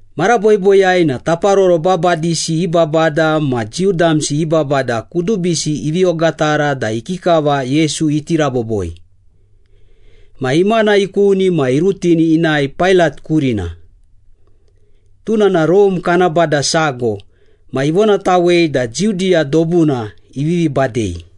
Mara boiboiyai na taparoro babadisi i babada ma Jiu damsi i babada kudubisi ivi ogatara da ikikava Yesu iti raboboi. Ma imana ikuni ma irutini inae Pailat kurina. Tuna na Rome kana bada sago ma ivonatawei da Judiya dobuna ivivi badei.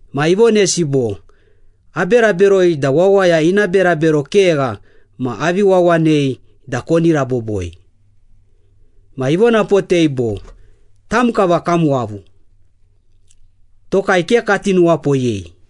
Ma ivonesi bo, “Abera beroi da wawaya ina berabero kegha ma avi wawanei da koni raboboi.” Ma ivonapotei bo, “Tam kava kam wavu. Tokai ke kati nuwapoyei.”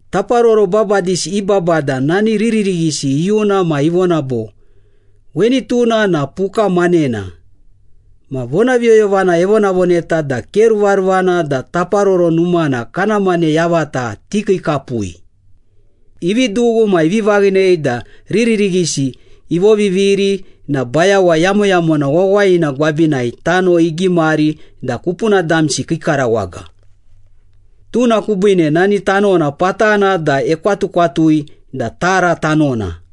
Taparoro babadisi i babada nani riririghisi iyuna ma ivona bo, “Weni tuna na puka manena, ma vonaviyoyovana evonavoneta da ke ruvaruvana da Taparoro Numana kana mane yavata tikiikapui.” Ivi dughu ma ivi vaghinei da riririghisi ivoviviri na bayawa yamoyamona wawayina gwabinai tano igimari da kupuna damsi kii karawaga. Tuna kubiine nani tanona patana da ekwatukwatui da ‘Tara Tanona.’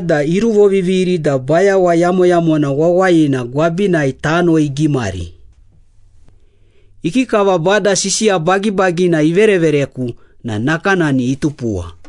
da iruvoviviri da bayawa yamoyamona wawayina gwabinai tano igimari. Ikikava Bada sisiya bagibagina iverevereku na nakanani itupuwa.”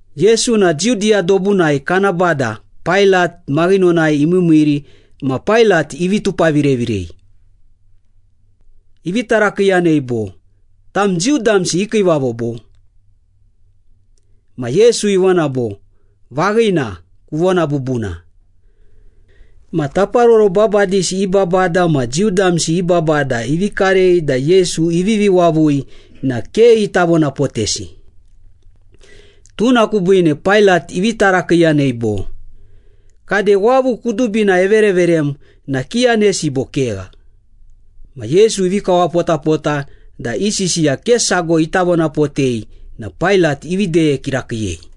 Yesu na Judiya dobuna kana bada Pailat maghinonai imiimiiri ma Pailat ivi tupavirevirei. Ivi tarakiiyanei bo, “Tam Jiu damsi i kiivavo, bo?” Ma Yesu ivona bo, “Vaghina, kuvona bubuna.” Ma taparoro babadisi i babada ma Jiu damsi i babada ivi karei da Yesu ivivi wavui na ke ita vonapotesi. Tuna kubiine Pailat ivi tarakiiyanei bo, “Kade, wavu kudubina evereverem na kiyanesi bo kegha?” Ma Yesu ivi kawapotapota da i sisiya ke sago ita vonapotei na Pailat ivi deye kirakiiyei.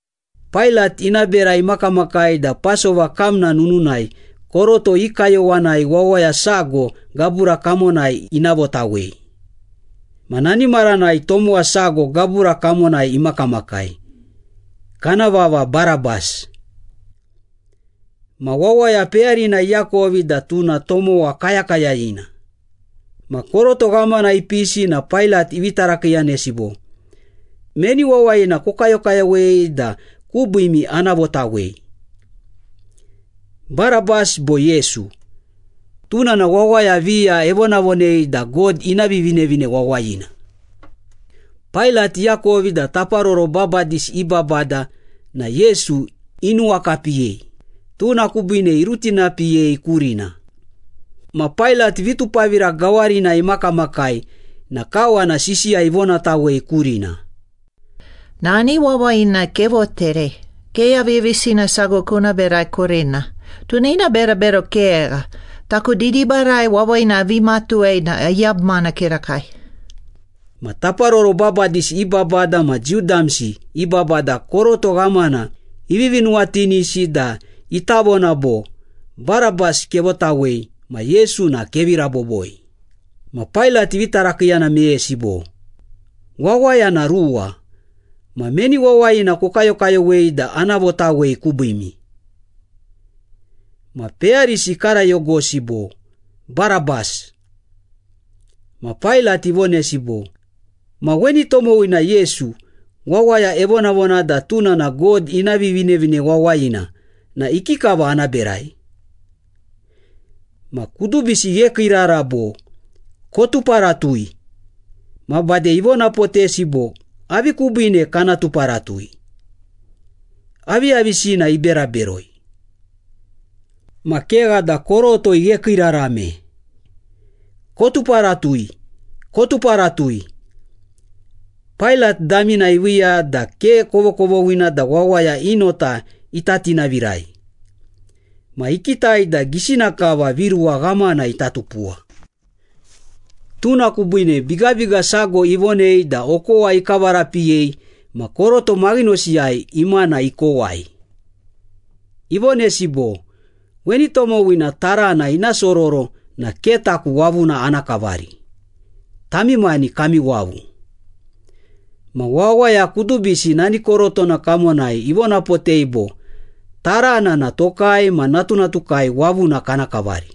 Pailat ina bera imakamakai da Pasova kamna nununai koroto i kayowanai wawaya sago gabura kamonai ina votawei. Ma nani maranai tomowa sago gabura kamonai imakamakai, kana vava Barabas. Ma wawaya peyarina iakovi da tuna tomowa kayakayayina. Ma koroto ghamana ipisi na Pailat ivi tarakiiyanesi bo, “Meni wawayina kokayokayowei da kubiimi ana votawei? Barabas bo Yesu, tuna na wawaya viya evonavonei da God ina Vivinevine Wawayina.” Pailat iakovi da taparoro babadisi i babada na Yesu inuwakapiyei, tuna kubiine irutinapiyei kurina. Ma Pailat vitupavira gawarinai imakamakai na kawana sisiya ivonatawei kurina. “Nani wawayina kevoterei. Ke aviyavisina sago kuna berai kurina. Tuna ina berabero kegha. Taku didibarai wawayina avi matuwei na ayabumana kirakai.” Ma taparoro babadisi i babada ma Jiu damsi i babada koroto ghamana ivivi nuwatinisi da ita vona bo, “Barabas kevotawei ma Yesu na kevi raboboi.” Ma Pailat ivi tarakiiyana meyesi bo, “Wawaya na ruwa, ma meni wawayina kokayokayowei da ana votawei kubiimi?” Ma peyarisi ikarayogosi bo, “Barabas!” Ma Pailat ivonesi bo, “Ma weni tomowina Yesu, wawaya evonavona da tuna na God ina Vivinevine Wawayina na ikikava ana berai?” Ma kudubisi ighekiirara bo, “Kotuparatui!” Ma bade ivonapotesi bo, “Avi kubiine kana tuparatui? Aviyavisina ibera beroi?” Ma kegha da koroto ighekiirarame. “Kotuparatui! Kotuparatui!” Pailat damina iviiya da ke kovokovoghina da wawaya i nota ita tinavirai. Ma ikitai da gisina kava viruwa ghamana ita tupuwa. Tuna kubiine bigabiga sago ivonei da okowa ikavarapiyei ma koroto maghinosiyai imana ikowai. Ivonesi bo, “Weni tomowina tarana ina sororo na ke taku wavuna ana kavari, tami mani kami wavu!” Ma wawaya kudubisi nani korotona kamonai ivonapotei bo, “Tarana na tokai ma natunatukai wavuna kana kavari!”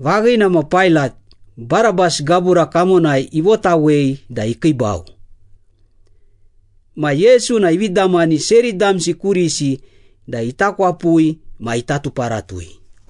Vaghina ma Pailat, Barabas gabura kamonai ivotawei da ikiibau. Ma Yesu na ivi damani seri damsi kurisi da ita kwapui ma ita tuparatui.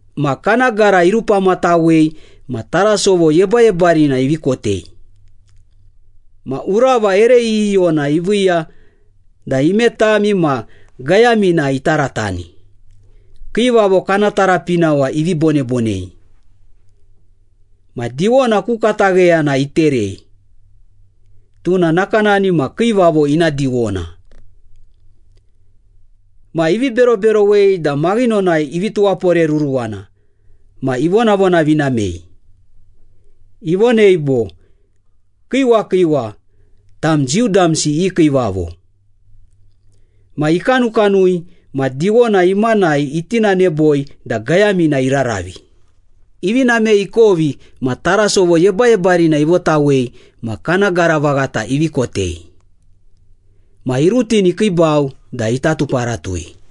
Ma kana gara irupamatawei ma tarasovo yebayebarina ivi kotei. Ma urava ere iyiyona iviiya da imetami ma gayamina itaratani, kiivavo kana tarapinawa ivi bonebonei. Ma diwona ku katagheyana iterei. Tuna nakanani ma kiivavo ina diwona. Ma ivi beroberowei da maghinonai ivi tuwaporeruruwana ma ivonavonavinamei. Ivonei bo, “Kiiwa kiiwa, tam Jiu damsi i kiivavo!” Ma ikanukanui ma diwona imanai itinaneboi da gayamina iraravi. Ivi namei ikovi ma tarasovo yebayebarina ivotawei ma kana gara vaghata ivi kotei. Ma irutini ikiibau da ita tuparatui.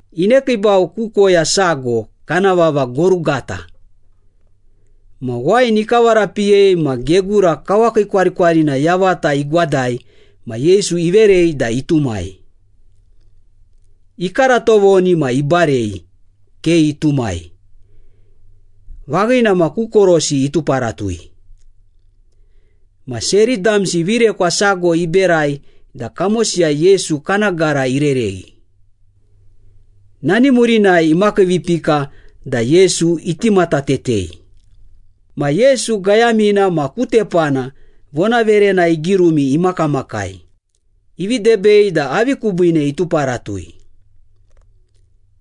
Inekiibau ku koya sago, kana vava Gorugata. Ma wain ikavarapiyei ma gegura kawakiikwarikwarina yavata igwadai ma Yesu iverei da itumai. Ikara tovoni ma ibarei, ke itumai. Vaghina ma ku korosi ituparatui. Ma seri damsi virekwa sago iberai da kamosiyai Yesu kana gara irereghi. Nani murinai imakiivipika da Yesu iti matatetei. Ma Yesu gayamina ma ku tepana vonaverena igirumi imakamakai, ivi debei da avi kubiine ituparatui.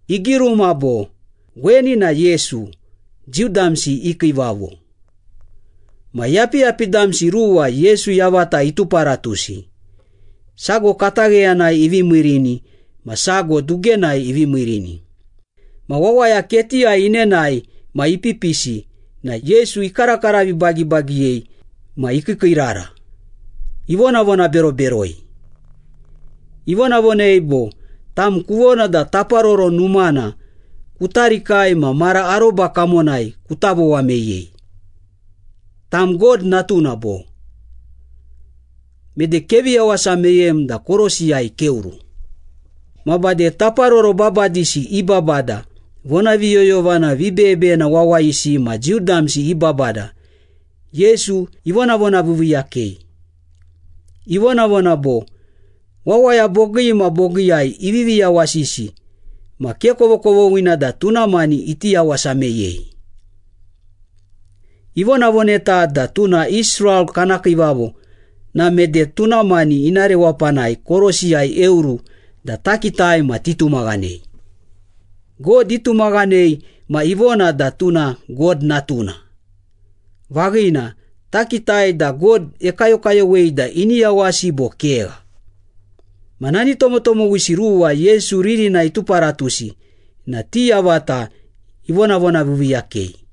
Igiruma bo, “Weni na Yesu, Jiu damsi i kiivavo.” Ma yapiyapi damsi ruwa Yesu yavata ituparatusi, sago katagheyanai ivi miirini ma sago dugenai ivi miirini. Ma wawaya ketiyai inenae ma ipipisi na Yesu ikarakara vibagibagiyei ma ikiikiirara, ivonavonaberoberoi. Ivonavonei bo, “Tam kuvona da Taparoro Numana kuta rikai ma mara aroba kamonai kuta vowa meyei. Tam God Natuna, bo? Mede kevi yawasa meyem da korosiyai keoru!” Ma bade taparoro babadisi i babada, vonaviyoyovana vibeyebeyena wawayisi ma Jiu damsi i babada Yesu ivonavonaviiviiyakei. Ivonavona bo, “Wawaya bogii ma bogiiyai ivivi yawasisi ma ke kovokovoghina da tuna mani iti yawasa meyei. Ivonavoneta da tuna Israel kana kiivavo na mede tuna mani ina rewapanai korosiyai eoru da takitai ma titumaghanei. God itumaghanei ma ivona da tuna God Natuna. Vaghina, takitai da God ekayokayowei da ini yawasi bo kegha.” Ma nani tomotomowisi ruwa Yesu ririnai ituparatusi na ti yavata ivonavonaviiviiyakei.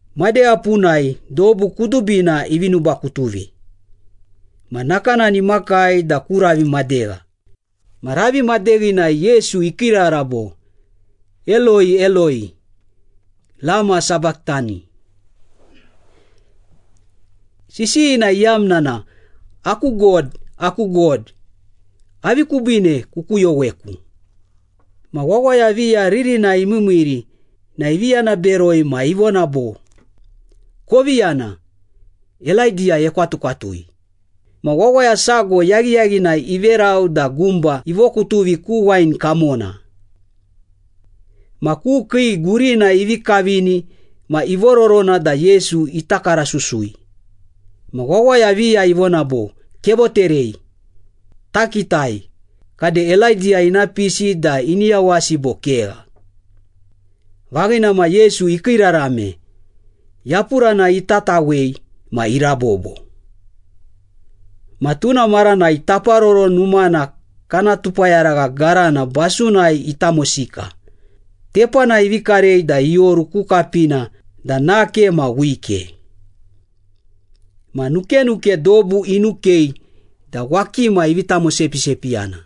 Madegha punai dobu kudubina ivi nubakutuvi, ma nakanani imakai da ku ravi madegha. Ma ravi madeghinai Yesu ikiirara bo, “Eloi, Eloi, lama sabachthani?” Sisiyina iyamna na “Aku God, aku God, avi kubiine kukuyoweku?” Ma wawaya viya ririnai imiimiiri na ivi yana beroi ma ivona bo, “Kovi yana, Elaidiya ekwatukwatui.” Ma wawaya sago yaghiyaghinai iverau da gumba ivokutuvi ku wain kamona. Ma ku kii gurina ivi kavini ma ivororona da Yesu ita karasusui. Ma wawaya viya ivona bo, “Kevoterei. Takitai, kade Elaidiya ina pisi da ini yawasi bo kegha.” Vaghina ma Yesu ikiirarame, yapurana itatawei ma irabobo. Ma tuna maranai Taparoro Numana kana tupayaragha garana basunai itamosika, tepanai ivi karei da ioru ku kapina da nake ma wike. Ma nukenuke dobu inukei da wakima ivi tamosepisepiyana.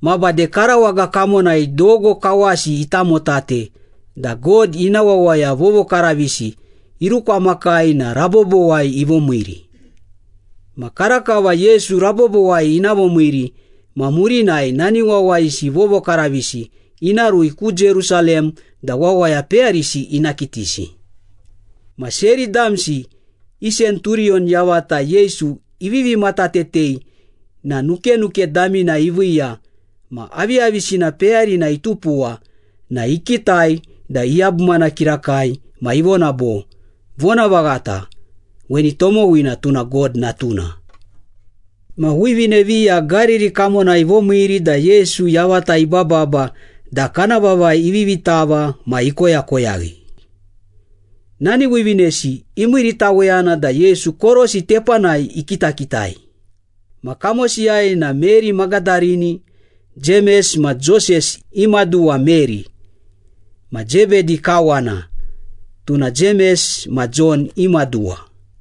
Ma bade karawaga kamonai dogo kawasi itamotate da God ina wawaya vovokaravisi irukwamakai na rabobowai ivomiiri. Ma karakava Yesu rabobowai ina vomiiri ma murinai nani wawayisi vovokaravisi ina rui ku Jerusalem da wawaya peyarisi ina kitisi. Ma seri damsi i senturiyon yavata Yesu ivivi matatetei na nukenuke damina iviiya ma aviyavisina peyarina itupuwa na ikitai da iyabumana kirakai ma ivona bo, “Vonavaghata, weni tomowina tuna God Natuna.” Ma wivine viya Gariri kamonai ivomiiri da Yesu yavata ibababa da kana vavai ivivi tava ma ikoyakoyaghi. Nani wivinesi imiiritaweyana da Yesu korosi tepanai ikitakitai, ma kamosiyai na Meri Magadarini, Jemes ma Joses i maduwa Meri, ma Zebedi kawana, tuna Jemes ma Jon i maduwa.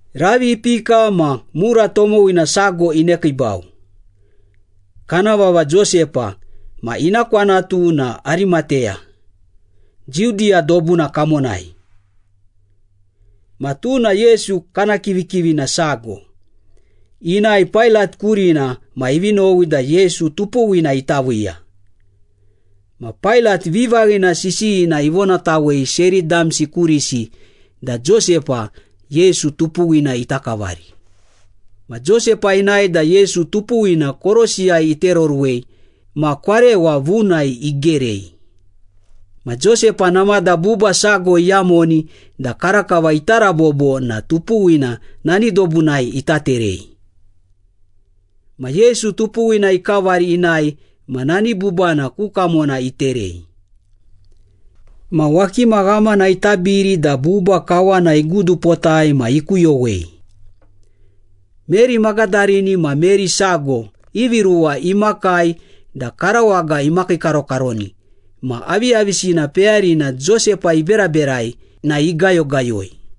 Ravi ipika ma mura tomowina sago inekiibau. Kana vava Josepa ma ina kwanatu na Arimateya, Judiya dobuna kamonai. Ma tuna Yesu kana kivikivina sago. Inae Pailat kurina ma ivi nowi da Yesu tupuwina ita viiya. Ma Pailat vivaghina sisiyina ivonatawei seri damsi kurisi da Josepa, Yesu tupuwina ita kavari. Ma Josepa inae da Yesu tupuwina korosiyai itereoruwei ma kwarewa vunai igerei. Ma Josepa namada buba sago iyamoni da karakava ita rabobo na tupuwina nani dobunai ita terei. Ma Yesu tupuwina ikavari inae ma nani bubana ku kamona iterei. Ma wakima ghamana itabiri da buba kawana igudupotai ma ikuyowei. Meri Magadarini ma Meri sago ivi ruwa imakai da karawaga imakiikarokaroni ma aviyavisina peyarina Josepa iberaberai na igayogayoi.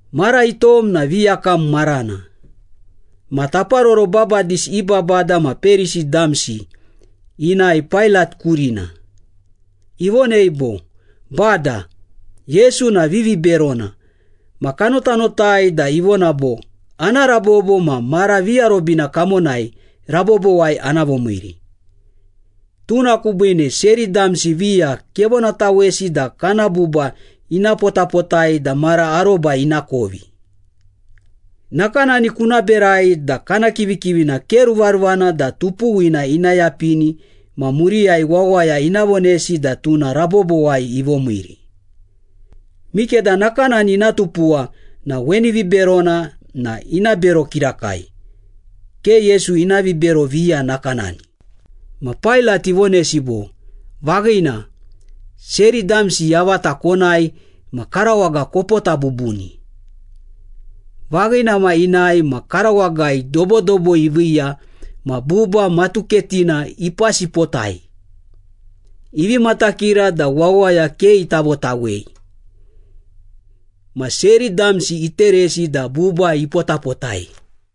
Mara itom na viyakam marana. Ma taparoro babadisi i babada ma Perisi damsi inae Pailat kurina. Ivonei bo, “Bada, Yesu na viviberona ma kanotanotai da ivona bo, ‘Ana rabobo ma mara viarobina kamonai rabobowai ana vomiiri.’ Tuna kubiine seri damsi viya kevonatawesi da kana buba ina potapotai da mara aroba ina kovi. Nakanani kuna berai da kana kivikivina ke ruvaruvana da tupuwina ina yapini ma muriyai wawaya ina vonesi da tuna rabobowai ivomiiri. Mikeda nakanani ina tupuwa na weni viberona na ina bero kirakai, ke Yesu ina vibero viya nakanani.” Ma Pailat ivonesi bo, “Vaghina, seri damsi yavata konae ma karawaga kopota bubuni.” Vaghina ma inae ma karawagai dobodobo iviiya ma buba matuketina ipasipotai, ivi matakira da wawaya ke ita votawei. Ma seri damsi iteresi da buba ipotapotai.